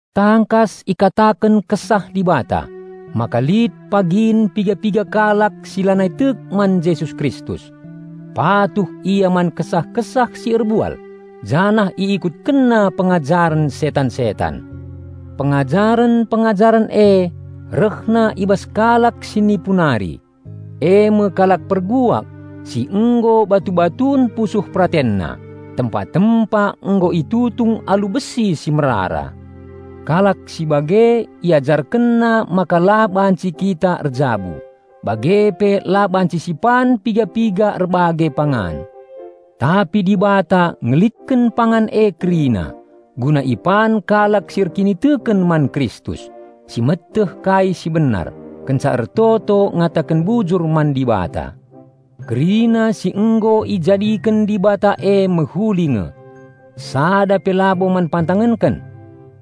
Tangkas ikataken Kesah Dibata maka lit pagin piga-piga kalak si lanai tek man Jesus Kristus. Patuh ia man kesah-kesah si erbual janah iikutkenna pengajaren setan-setan. Pengajaren-pengajaren e rehna i bas kalak si nipu nari, e me kalak perbual si nggo batu-batun pusuh peratenna, tempa-tempa nggo itutung alu besi si merara. Kalak si bage, iajarkenna maka la banci kita erjabu, bage pe la banci sipan piga-piga erbage pangan. Tapi Dibata ngelitken pangan e kerina guna ipan kalak si erkiniteken man Kristus, si meteh kai si benar, kenca ertoto ngataken bujur man Dibata. Kerina si nggo ijadiken Dibata e mehuli nge. Sada pe labo man pantangenken.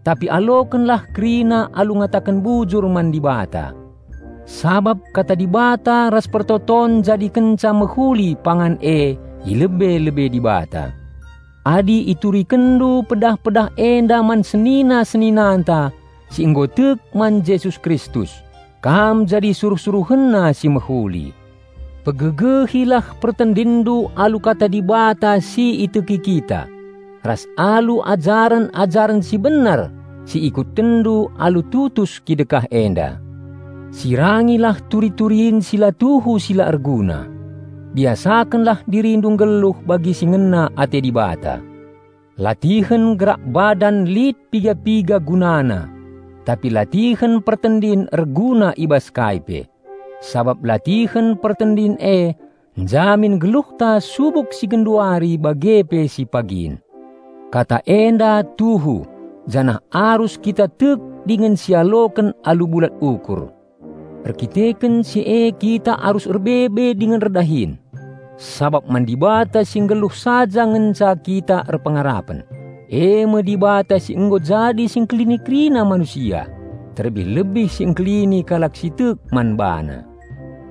Tapi alokenlah kerina alu ngataken bujur man Dibata, sabap Kata Dibata ras pertoton njadikenca mehuli pangan e i lebe-lebe Dibata. Adi iturikenndu pedah-pedah enda man senina-seninananta si nggo tek man Jesus Kristus, kam jadi suruh-SuruhenNa si mehuli. Pegegehilah pertendinndu alu kata Dibata si iteki kita, ras alu ajaren-ajaren si benar si ikutkenndu alu tutus kidekah enda. Sirangilah turi-turin si la tuhu si la erguna. Biasakenlah dirindu nggeluh bagi si ngena ate Dibata. Latihen gerak badan lit piga-piga gunana, tapi latihen pertendin erguna i bas kai pe, sabap latihen pertendin e njamin geluhta subuk si genduari bage pe si pagin. Kata enda tuhu janah arus kita tek dingen sialoken alu bulat ukur. Erdandanken si e kita arus erbebe dingen erdahin. Sabap man Dibata si nggeluh saja ngenca kita erpengarapen, e me Dibata si nggo jadi Si Engkelini kerina manusia, terlebih-lebih Si Engkelini kalak si tek man BaNa.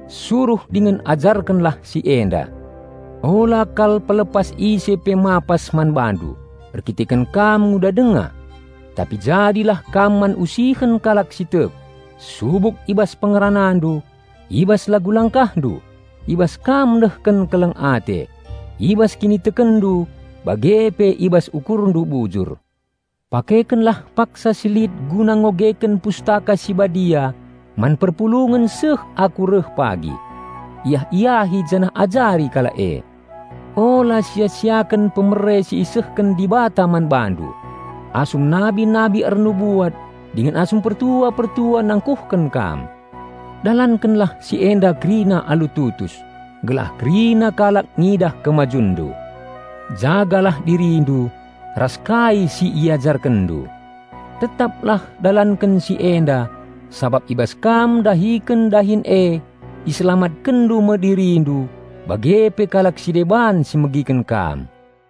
Suruh dingen ajarkenlah si enda. Ula kal pelepas ise pe mapas man bandu erkiteken kam nguda denga. Tapi jadilah kam man usihen kalak si tek, subuk i bas pengeranandu, i bas lagu langkahndu, i bas kam nehken keleng ate, i bas kinitekenndu bage pe i bas ukurndu bujur. Pakekenlah paksa si lit guna ngogeken Pustaka Si Badia man perpulungen seh aku reh pagi. Iah-iahi janah ajari kalak e. Ula sia-siaken pemere si isehken Dibata man bandu asum nabi-nabi ernubuat dingen asum pertua-pertua nangkuhken kam. Dalankenlah si enda kerina alu tutus, gelah kerina kalak ngidah kemajunndu. Jagalah dirindu ras kai si iajarkenndu. Tetaplah dalanken si enda sabap i bas kam ndahiken dahin e iselamatkenndu me dirindu bage pe kalak si deban si megiken kam.